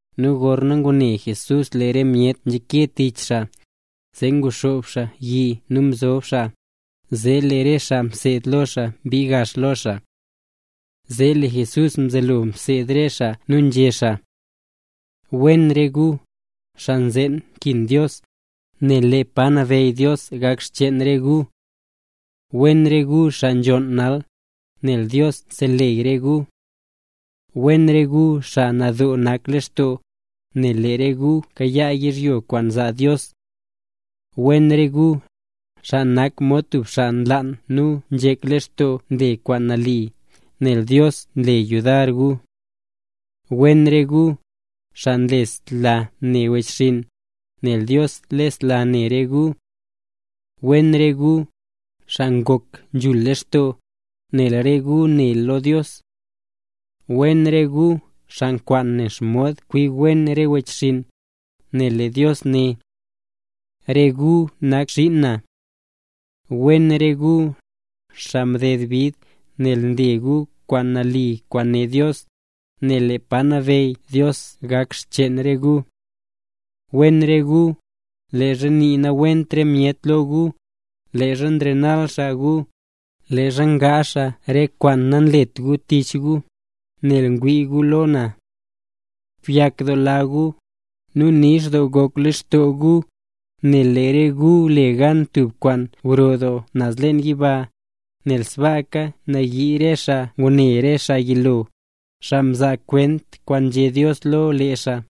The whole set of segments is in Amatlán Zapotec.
Nu gorna ngune Jesús lee re myet nzhake tich xaa, zee nguxoob yi nu mzob xaa, zee lee re xaa mseed lo Jesús mbii gax lo xaa. Zee lee Jesús mzelo mseed re xaa nu nzhé xaa: —Wen re gu, xaa nzeen nkin Dios, nel lee pa nabeyy Dios gak xcheen re gu. ’Wen re gu, xaa nzhonn nal, nel Dios seleyy re gu. ’Wen re gu, xaa nadoo nak lextoo, nel lee re gu kayaa yizhyo kwaan zaa Dios. ’Wen re gu, xaa nak mod tub xaa nlaan nu nzhek lextoo nle kwaan nali, nel Dios zle yudar gu. ’Wen re gu, xaa nlesla ne wechxinn, nel Dios lesla ne re gu. ’Wen re gu, xaa ngok nzhul lextoo, nel re gu ne lo Dios. ’Wen re gu, xaa nkwaan ne xomod kwi wen re wechxinn, nel lee Dios né: “Re gu nak xiin na”. ’Wen re gu, xaa mded bid nel nle gu kwaan nali kwaan né Dios, nel lee pa nabeyy Dios gak xcheen re gu. ’Wen re gu, leezha nii nawent re myet lo gu, leezha nrenal xaa gu, leezha ngaazh xaa re kwaan namlet gu tich gu, nel ngwii gu lo na. Byakdoola gu, nu nix doo gok lextoo gu, nel lee re gu le gan tub kwaan gro doo naz leen yiba, nel sbaaka mnayii re xaa ngune re xaa yilo, xaa mzaa kwent kwaan nzhé Dios lo lee xaa.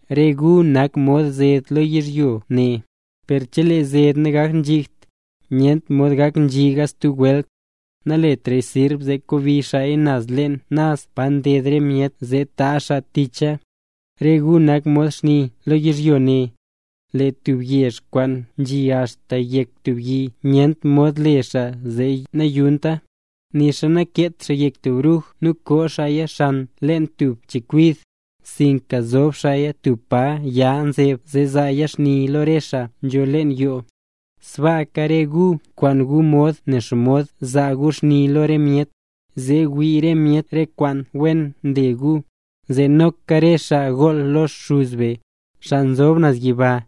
’Re gu nak mod zed lo yizhyo ne, per chelee zed nagaknzhigt, nyent mod gaknzhiga stub welt. Naletra sirb zee kobi xaaya naz leen naz pa nded re myet zee taazh nii re myet ticha. ’Re gu nak mod xni lo yizhyo ne. Lee tub yezh kwaan nzhi axta yek tub yi nyent mod le xaa zee nayunta. Nixa nakeet xaa yek tub bruj nu koo xaaya leen tub chekwid, sinka nzob xaaya tub pa ya nzeb zee zaaya xni lo rese xaa nzho leen yoo. Sbaaka re gu nkwaan gu mod ne xomod zaa gu xni lo re myet, zee wii re myet re kwaan wen nle gu, zee noka re xaa gool lo Xuz be, xaa nzob naz yiba.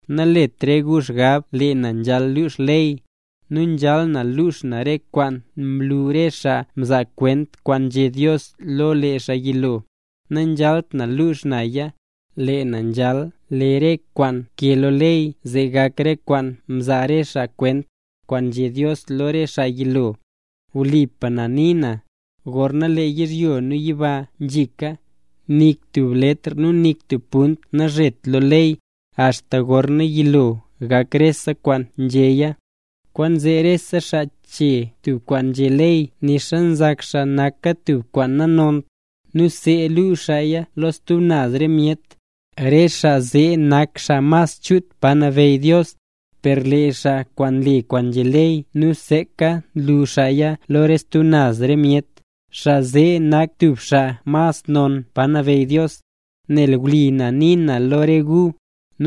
’Nalet re gu xgab lee na nzhal lux ley, nu nzhal na lux na re kwaan mlu re xaa mzaa kwent kwaan nzhé Dios lo lee xaa yilo; nanzhalt na lux naya, lee na nzhal le re kwaan nkee lo ley zee gak re kwaan mzaa re xaa kwent, kwaan nzhé Dios lo re xaa yilo. Wlipa na nii na, gorna lee yizhyo nu yiba nzhika, nik tub letr nu nik tub punt nazhet lo ley, axta gorna yilo gak rese kwaan nzhéya. Kwaanzee rese xaa che tub re kwaan nzhé ley nixa nzak xaa naka tub kwaan nanont, nu see lu xaaya lo re stub naz re myet, re xaa zee nak xaa mas chut pa nabeyy Dios; per lee xaa kwaan nle kwaan nzhé ley nu seeka nlu xaaya lo re stub naz re myet, xaa zee nak tub xaa mas non pa nabeyy Dios. Nel wli na nii na lo re gu,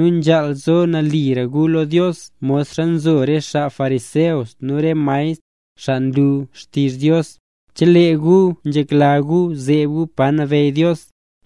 nzhaal zo nalira gu lo Dios mod nzo re xaa fariseo nu re maestr, xaa nlu xtizh Dios, chelee gu nzhekla gu zeeb gu pa nabeyy Dios.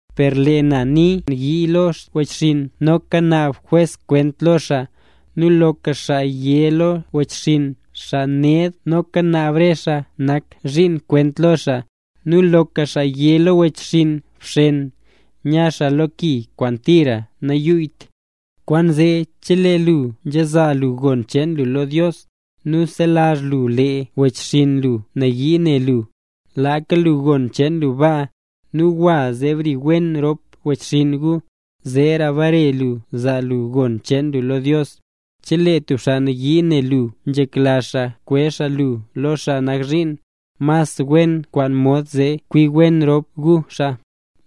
Per lee na nii: Loka cho xaa kwaan yii lo wechxinn noka naab jwes kwent lo xaa, nu loka xaa yé lo wechxinn “Xaa ned” noka naab re xaa nak zhiin kwent lo xaa, nu loka xaa yé lo wechxinn “Bxen” nya xaa lo ki kwaan tira nanyuyyt. ’Kwaanzee chelee lu nzhazaala lu gon cheen lu lo Dios, nu mselazh lu lee wechxinn lu nayii ne lu, laaka lu gon cheen lu baa, nu gwa zee bri wen rop wechxinn gu, zeera bare lu zaa lu gon cheen lu lo Dios. ’Chelee tub xaa nayii ne lu nu nzhekla xaa kwezh xaa lu lo xaa nak zhiin, mas wen kwaan mod zee kwi wen rop gu xaa,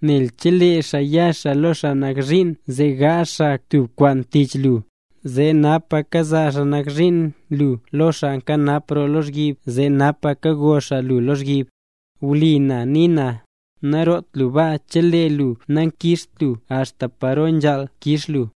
nel chelee xaa ya xaa lo xaa nak zhiin zee gaazh xaa tub kwaan tich lu, zee napa kazaa xaa nak zhiin lu lo xaa nkanap roo lozhyib zee napa kago xaa lu lozhyib. Wlipa na nii na, naroot lu baa chelee lu nakixt lu axta paro nzhaal kix lu.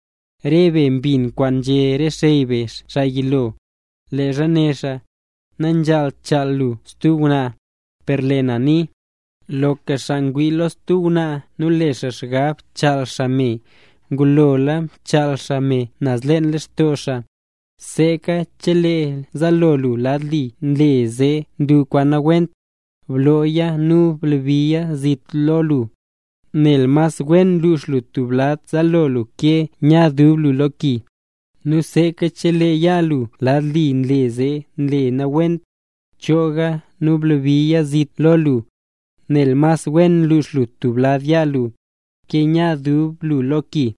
’Re be mbin kwaan nzhé re xey be xaa yilo, leezha né xaa: “Nanzhaalt chaal lu stub ngwnaa”. Per lee na nii: Loka xaa kwaan wii lo tub ngwnaa nu le xaa xgab chaal xaa me, ngulola mchaal xaa me naz leen lextoo xaa. Seeka chelee zaalo lu lad li nle zee nle lu kwaan nawent, blooya nu blabiya zit lo lu, nel mas wen lux lu tub lad zaalo lu ke nya dub lu lo ki. Nu seeka chelee yaa lu lad li nle zee nle lu kwaan nawent, chooga nu blabiya zit lo lu, nel mas wen lux lu tub lad yaa lu, ke nya dub lu lo ki.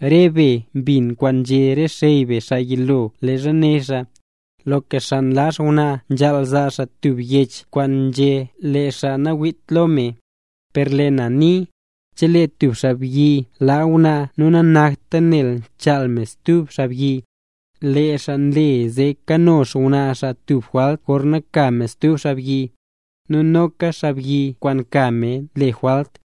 ’Re be mbin kwaan nzhé re xey be xaa yilo leezha né xaa: “Loka xaa nlaa xngwnaa, nzhaal zaa xaa tub yech kwaan nzhé lee xaa nawiitra lo me”. Per lee na nii: Chelee tub xaabyi laa xngwnaa nu nanakta nel mchaal me stub xaabyi, lee xaa nle zee kano xngwnaa xaa tub jwalt gorna ka me stub xaabyi, nu noka xaabyi kwaan ka me le jwalt.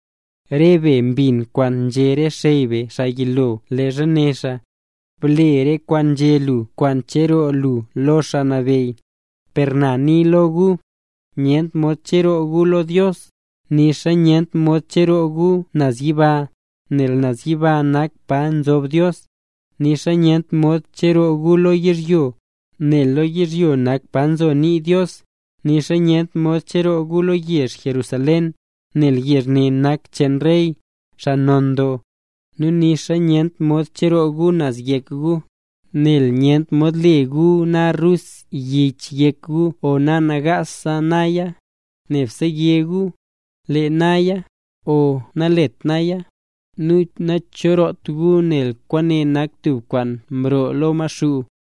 ’Re be mbin kwaan nzhé re xey be xaa yilo leezha né xaa: “Ble re kwaan nzhé lu kwaan ncheroo lu lo Xaa Nabeyy”. Per na nii lo gu: Nyent mod cheroo gu lo Dios, nixa nyent mod cheroo gu naz yiba, nel naz yiba nak pa nzob Dios. Nixa nyent mod cheroo gu lo yizhyo, nel lo yizhyo nak pa nzo nii Dios, nixa nyent mod cheroo gu lo yezh Jerusalén, nel yezh ne nak cheen Rey, xaa non doo. Nu nixa nyent mod cheroo gu naz yek gu, nel nyent mod le gu na rus yich yek gu o nagaas naya. Nebse yé gu: “Le naya”, o “Nalet naya”. Nu nacheroot gu nel kwaane nak tub kwaan nroo lo Maxuu.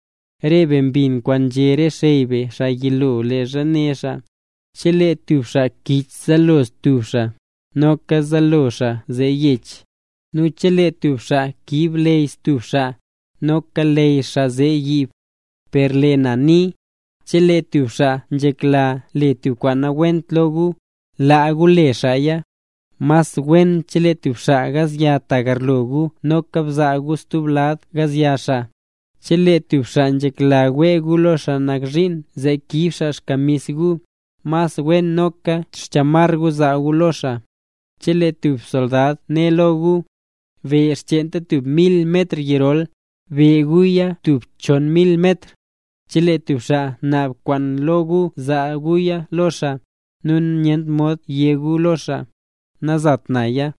’Re be mbin kwaan nzhé re xey be xaa yilo leezha né xaa: “Chelee tub xaa kich zaalo stub xaa, noka zaalo xaa zee yech. Nu chelee tub xaa kiib leyy stub xaa, noka leyy xaa zee yiib.” Per lee na nii: Chelee tub xaa nzhekla le tub kwaan nawent lo gu, laa gu le xaaya. Mas wen chelee tub xaa gazya tagarlo gu noka bzaa gu stub lad gazya xaa. Chelee tub xaa nzhekla wee gu lo xaa nak zhiin zee kiib xaa xkamis gu, mas wen noka xchamar gu bzaa gu lo xaa. Chelee tub soldad né lo gu: “Be xcheenta tub mil metr yirol”, be guya tub chon mil metr. Chelee tub xaa naab kwaan lo gu, zaa guya lo xaa, nu nyent mod yé gu lo xaa: “Nazaat naya”.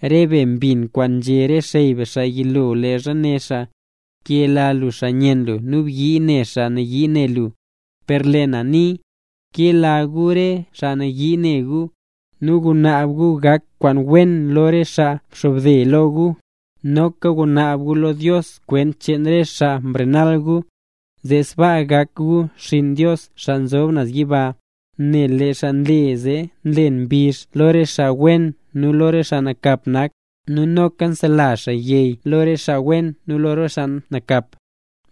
’Re be mbin kwaan nzhé re xey be xaa yilo leezha né xaa: “Kela lu xaa nyenn lu, nu byii ne xaa nayii ne lu”. Per lee na nii: Kela gu re xaa nayii ne gu, nu gunaab gu gak kwaan wen lo re xaa mxobde lo gu, noka gunaab gu lo Dios kwent cheen re xaa nrenal gu. Zee sbaa gak gu xinn Dios xaa nzob naz yiba, nel lee xaa nle zee nlen mbizh lo re xaa wen nu lo re xaa nakap nak, nu noka nsela xaa yey lo re xaa wen nu lo re xaa nakap nak.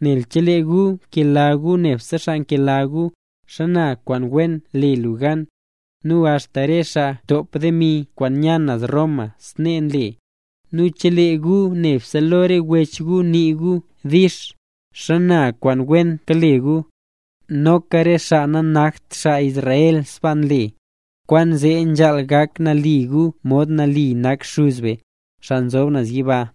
Nel chelee gu kela gu nebse xaa nkela gu, ¿xana kwaan wen le gu gan? Nu axta re xaa ntop demi kwaan nya naz Roma snee nle. Nu chelee gu nebse lo re wech gu nii gu “dix”, ¿xana kwaan wen kale gu? Noka re xaa nanakt xaa Israel sbaa nle. Kwaanzee nzhaal gak nali gu mod nali nak Xuz be, xaa nzob naz yiba.